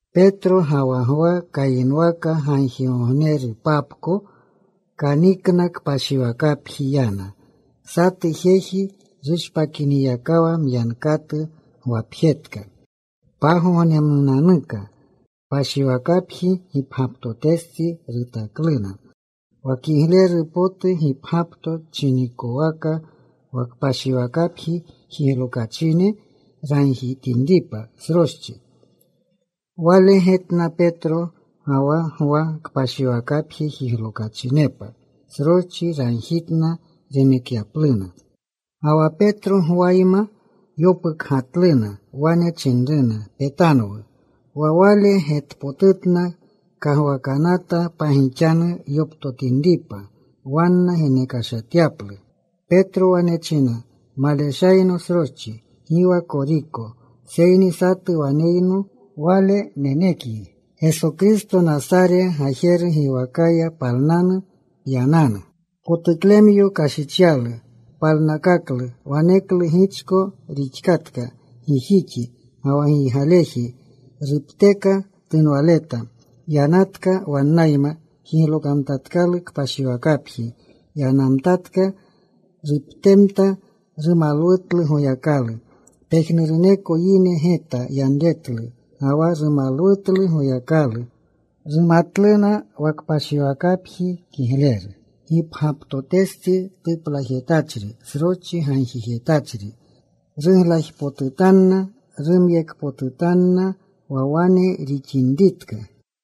Petro ga wa Gwa kayinwaka gagjigognepapko kanikna. Kpashiwakapji yana. Satu jeji rushpakinyakawa myankatu gwapjetka. Pagognemnunanuka kpashiwakapji gipgyaptotestsi rutakluna, wa Kigleru potu Gipgyapto chinikowaka. Wa kpashiwakapji jiglokachine ragjitinripa sroschi. Wale getna Petro ga wa Gwa kpashiwakapji jiglokachinepa. Sroschi ragjitna renekyapluna. Ga wa Petro Gwayma yopukgatluna. Wane chinru, “Petanwu.” Wa wale getpotutna. Kagwakanata pagixanu yoptotinripa, wanna genekashatyaplu. Petro wane china, “Maleshayno sroschi, gi wa koriko. Seyni satu waneyno. Wale nenekyi. Geso Kristo Nasare gajeru giwakaya, palnanu. Pyananu.” Potuklemyo kashichyalu. Palnakaklu. Waneklu gichko rixkatka gijixi ga wa giygaleji. Rupteka tunwaleta. Yanatka. Wannayma jiglokamtatkalu kpashiwakapji. Yanamtatka. Ruptemta. Rumalwumtlu Goyakalu. Pejnuruneko yine geta yanretlu ga wa rumalwumtlu Goyakalu. Rumatluna wa kpashiwakapji Kigleru Gipgyaptotestsi tuplajetachri sroschi gagjijetachri. Ruglajpotutanna. Rumyekpotutanna wa wane rixinritka.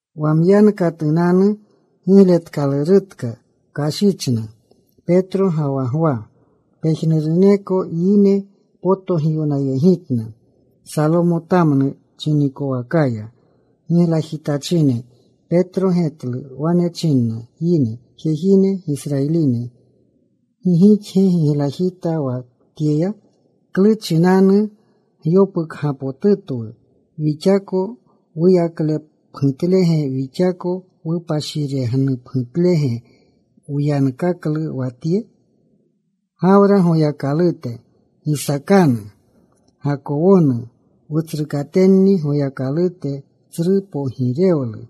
Wa myankatunanu gigletkalurutka kashichna Petro ga wa Gwa. Pejnuruneko yine potogiwnayegitna Salomotamnu chinikowakaya. Giglajitachine. Petro getlu. Wane chinna yine, “Jejine, Gisrayiline, ¿gi gixge giglajita wa tyeya? ¿Klu chinanu gyopukgapotutwu, wixako wuyaklepgutlege, wixako wupashirenupgutlege wyankakyalu wa tye? Gawra Goyakalute, Gisaakanu, Gakowonu, wutsrukatenni Goyakalute tsru pogirewlu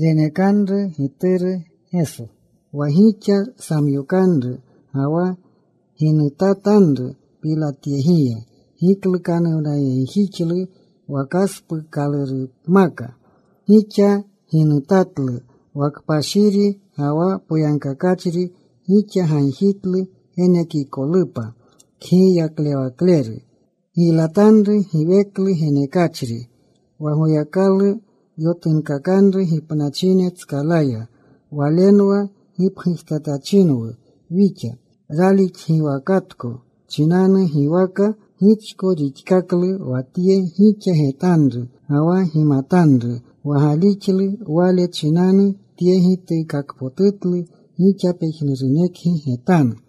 renekanru Gituru Geso, wa gixa samyokanru ga wa ginutatanru Pilatyegiya. Giklukanuwnayegjixlu wa kaspuukalurupmaka. Gixa ginutatlu wa Kpashiri ga wa Poyagkakachri. Gixa gagjitlu genekikolupa kgiylalewakleru. Giylatanru giweklu genekachri wa Goyakalu yotunkakanru gipnachine tskalaya. Walenwa gipgujtatachinwu wixa. Ralixgiwakatko chinanu, giwaka gichko rixkaklu wa tye, gixa getanru ga wa gimatanru. Wa galixlu Wale chinanu, tye gituukakpotutlu gixa pejnurunekgi getanu.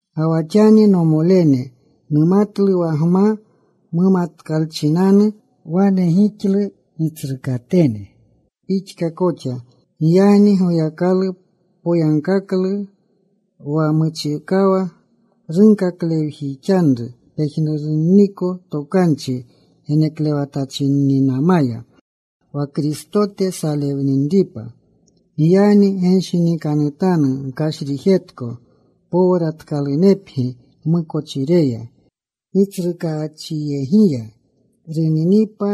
“Ga wa xani, nomolene, numatlu wa gma mumatkanchinanu wane gixlu, gitsrukatene pixka koxa. Giyagni Goyakalu poyagkaklu wa muchikawa runkaklewjixanru pejnurunniko tokanchi geneklewatachinninamaya, wa Kristote salewninripa. Giyagni genshinikanutanu. Gkashrijetko, powratkalunepgi gmukochireya, Gitsrukaachyegiya runinipa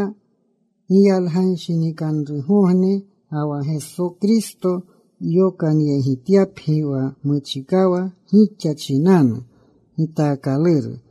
giyalganshinikanrugogne, ga wa Geso Kristo yokanyegityapgi, wa muchikawa gixa chinanu gitaakaluru.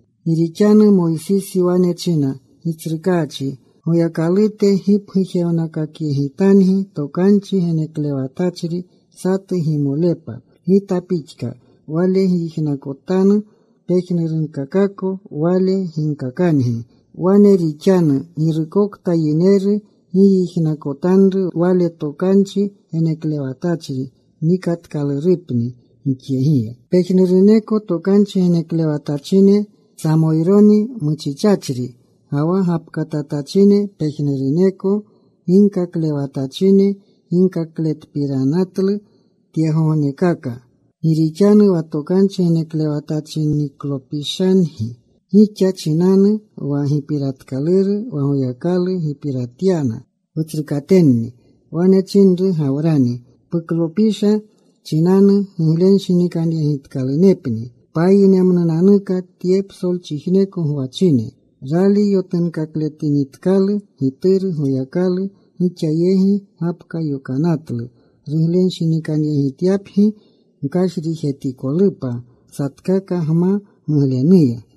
Gi rixanu Moysisi wane china, ‘Gitsrukaachi Goyakalute gipgujewnakakyegitangi Tokanchi Geneklewatachri satu gimolepa gita pixka. Wale gyijnakotanu pejnurkakako Wale ginkakangi. Wane rixanu: Girukokta yineru gi yijnakotanru Wale Tokanchi Geneklewatachri, nikatkalurupni yinyegiya.’ “Pejnuruneko tokanchi geneklewatachine, Samoyroni muchichachri ga wa gapkatamtachine, pejnuruneko ginkaklewatachine ginkakletpiranatlu tyegognekaka. Gixni wa tokanchi geneklewatachinniklopishangi. Gixa chinanni wa gipiratkaluru wa Goyakalu gipiratyana wutsrukatenni. Wane chinru Gawrani, ‘Puklopisha chinanu giglenshinikanyegitkalunepni payinemnunanuka tye psolchijneko gwachine.’ “Rali yotunkakletinitkalu Gituru Goyakalu gixa yegi gapka yokanatlu ruglenshinikanyegityapgi gkashrijetikolupa satkaka gma muglenuya.”